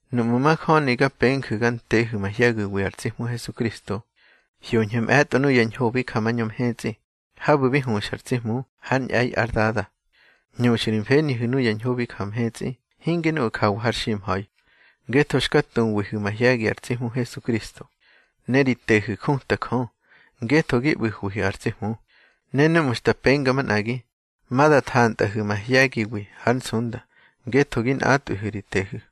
Nuꞌmu̱ majöni ga penju̱ ga ntehu̱ mahye̱giwi ar tsi Hmu Hesukristo, hyoñhu̱ mꞌe̱tꞌo nuya ñho bi ja mañö mhetsꞌi, habu̱ bi huxa ar tsi Hmu hár ñꞌe̱i ár Dada. Hñuxu̱ ri mfenihu̱ nuya ñho bi ja mhetsꞌi, hinge nuꞌu̱ jawa har ximha̱i. Ngetho xka tuwihu̱ mahye̱gi ar tsi Hmu Hesukristo, ne ri tehu̱ juta Jö, ngetho gi ꞌbu̱hwihu̱ ar tsi Hmu. Ne núꞌmu̱ xta penga manꞌagi, ma da thantꞌahu̱ mahye̱giwi hár nsunda, ngetho gi nꞌatꞌwihu̱ ri tehu̱.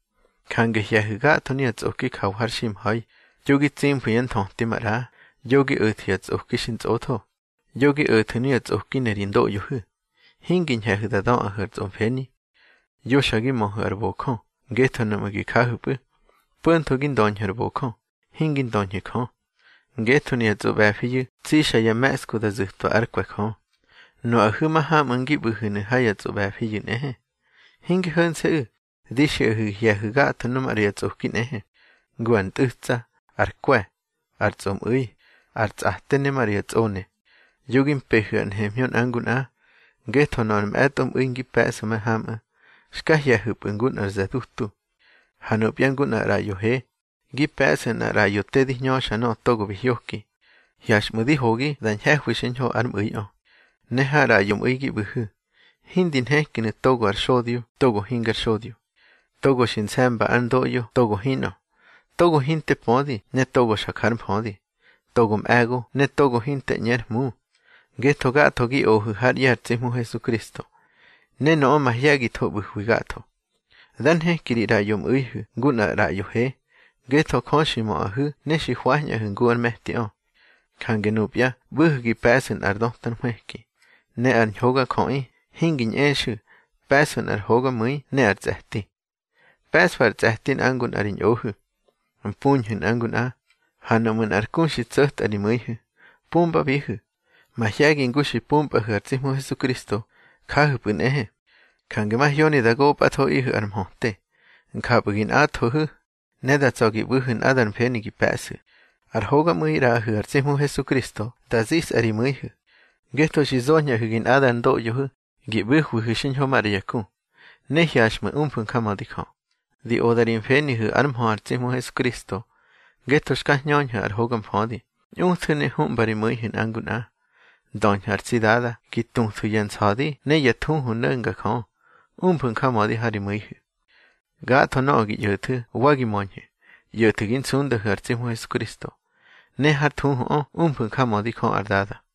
Jange hye̱hu̱ gatho nuya tsꞌoki jawa har ximha̱i: yo gi tsimfu̱ yá nthöti maꞌra, yo gi o̱thu̱ ya tsꞌoki xi ntsꞌotho, yo gi o̱thu̱ nuya tsꞌoki ne ri ndoꞌyohu̱, hingi ñhe̱hu̱ da döꞌahu̱ ar tsꞌomfeni. Yo xa gi möhu̱ ar bojö, ngetho nuꞌmu̱ gi jahu̱pꞌu̱, po̱ntho gi ndöñhu̱ ar bojö, hingi ndöñhu̱ Jö. Ngetho nuya tsꞌoꞌbe̱fiyu̱ tsixa ya me̱ꞌsku da zu̱twa ár kwe̱ Jö. Nuꞌahu̱ mahamꞌu̱ ngi ꞌbu̱hu̱nu̱ ha ya tsꞌoꞌbe̱fiyu̱ nꞌehe. Hinge ho̱nse̱ꞌu̱, di xiꞌahu̱ gi hye̱hu̱ gatho nu maꞌra ya tsꞌoki nꞌehe, ngu ar ntꞌu̱tsa, ar kwe̱, ar tsꞌomꞌu̱i, ar tsꞌate ne maꞌra ya tsꞌone. Yo gi mpehu̱ ar nhemhñö nꞌa ngu nꞌa, ngetho nöꞌö ar mꞌe̱tꞌo mꞌu̱i ngi pe̱ꞌsu̱ mahamꞌu̱, xka ꞌye̱ñhu̱pꞌu̱ ngu nꞌar ze̱ dutu. Ha nupya ngu nꞌar ꞌraꞌyo he, gi pe̱ꞌsu̱ nꞌar ꞌraꞌyo te di hñöxa nöꞌö togo bi hyoki. Hyaxꞌmu̱ di hogi da ñhe̱hwi xiñho ár mꞌu̱iꞌö. Ne har ꞌraꞌyo mꞌu̱i gi ꞌbu̱hu̱, hindi nhekinu̱ togo ar xodyo togo hingar xodyo, togo xi nse̱mba ár ndoꞌyo togo hinꞌö, togo hinte pödi ne togo xa jár mfödi, togo mꞌe̱go ne togo hinte ꞌñe ar hmu. Ngetho gatho gi ohu̱ hár ꞌye̱ ar tsi Hmu Hesukristo, ne nöꞌö mahye̱githo ꞌbu̱hwi gatho. Dá nheki ri ꞌraꞌyo mꞌu̱ihu̱ ngu nꞌar ꞌraꞌyo he, ngetho Jö xi möꞌahu̱ ne xi hwañꞌahu̱ ngu ár me̱tiꞌö. Jange nupya ꞌbu̱hu̱ gi pe̱ꞌsu̱ nꞌar döta nhwëki, ne ar ñhogajöꞌi, hingi ñꞌexu̱, pe̱ꞌsu̱ nꞌar hogamu̱i ne ar tsꞌe̱ti. Pe̱ꞌsfu̱ ar tsꞌe̱ti nꞌa ngu nꞌa ri ñꞌohu̱, mpuñhu̱ nꞌa ngu nꞌa, ha nuꞌmu̱ nꞌar ku xi tso̱tꞌa ri mu̱ihu̱, pumbabihu̱. Mahye̱gi ngu xi pumpꞌahu̱ ar tsi Hmu Hesukristo, jahu̱pꞌu̱ nꞌehe. Jange mahyoni da gopꞌathoꞌihu̱ ar mhöte. Njapꞌu̱ gi nꞌathohu̱, ne da tsa̱ gi ꞌbu̱hu̱ nꞌadar mfeni gi pe̱ꞌsu̱. Ar hogamꞌu̱i ꞌraꞌahu̱ ar tsi Hmu Hesukristo da zisꞌa ri mu̱ihu̱, ngetho xi zoñꞌahu̱ gi nꞌadar ndoꞌyohu̱ gi ꞌbu̱hwihu̱ xiñho maꞌra ya ku. Ne hyaxꞌmu̱ umfu̱ njamödi Jö. Di oda ri mfenihu̱ ár mhö ar tsi Hmu Hesukristo. Ngetho xka hñöñhu̱ ar hoga mfödi, ñꞌuthu̱ ne huꞌma ri mu̱ihu̱ nꞌa ngu nꞌa. Ndöñhu̱ ar tsi Dada gi tuthu̱ ya nsa̱di ne ya thuhu no̱nga Jö. Umfu̱ njamödi ha ri mu̱ihu̱. Gatho nöꞌö gi ꞌyo̱thu̱ wa gi möñhu̱, ꞌyo̱thu̱ gi nsundahu̱ ar tsi Hmu Hesukristo, ne hár thuhuꞌö umfu̱ njamödi Jö ar Dada.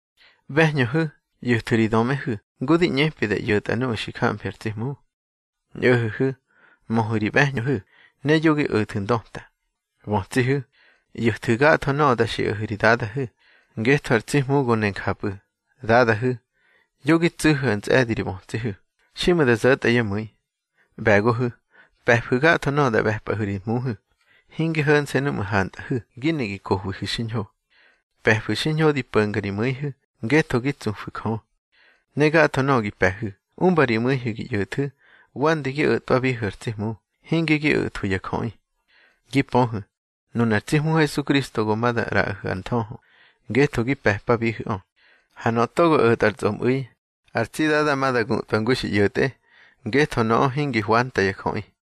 ꞌBe̱hñöhu̱, ꞌyo̱thu̱ ri dömehu̱ ngu di ꞌñepi da ꞌyo̱tꞌa nuꞌu̱ xi jamfi ar tsi Hmu. Ñꞌo̱ho̱hu̱, möhu̱ ri ꞌbe̱hñöhu̱, ne yo gi o̱thu̱ ndöta. Bötsihu̱, ꞌyo̱thu̱ gatho nöꞌö da xiꞌahu̱ ri dadahu̱, ngetho ar tsi Hmu go ne njapꞌu̱. Dadahu̱, yo gi tsu̱hu̱ ntsꞌe̱di ri bötsihu̱, xiꞌmu̱ da zo̱tꞌa yá mu̱i. ꞌBe̱gohu̱, pe̱fu̱ gatho nöꞌö da ꞌbe̱pꞌahu̱ ri hmuhu̱. Hinge ho̱nse̱ núꞌmu̱ hantꞌahu̱ gi ne gi kohwihu̱ xiñho. Pe̱fu̱ xiñho di po̱nga ri mu̱ihu̱, ngetho gi tsufu̱ Jö. Ne gatho nöꞌö gi pe̱hu̱, umba ri mu̱ihu̱ gi ꞌyo̱thu̱, wande gi o̱tꞌwabihu̱ ar tsi Hmu, hinge gi o̱thwu̱ ya jöꞌi. Gi pöhu̱, nunar tsi Hmu Hesukristo go ma da ꞌraꞌahu̱ ar nthöhö, ngetho gi pe̱pabihu̱ꞌö. Ha nöꞌö togo o̱tꞌa ar tsꞌomꞌu̱i, ar tsi Dada ma da gutꞌwa ngu xi ꞌyo̱tꞌe, ngetho nöꞌö hingi hwanta ya jöꞌi.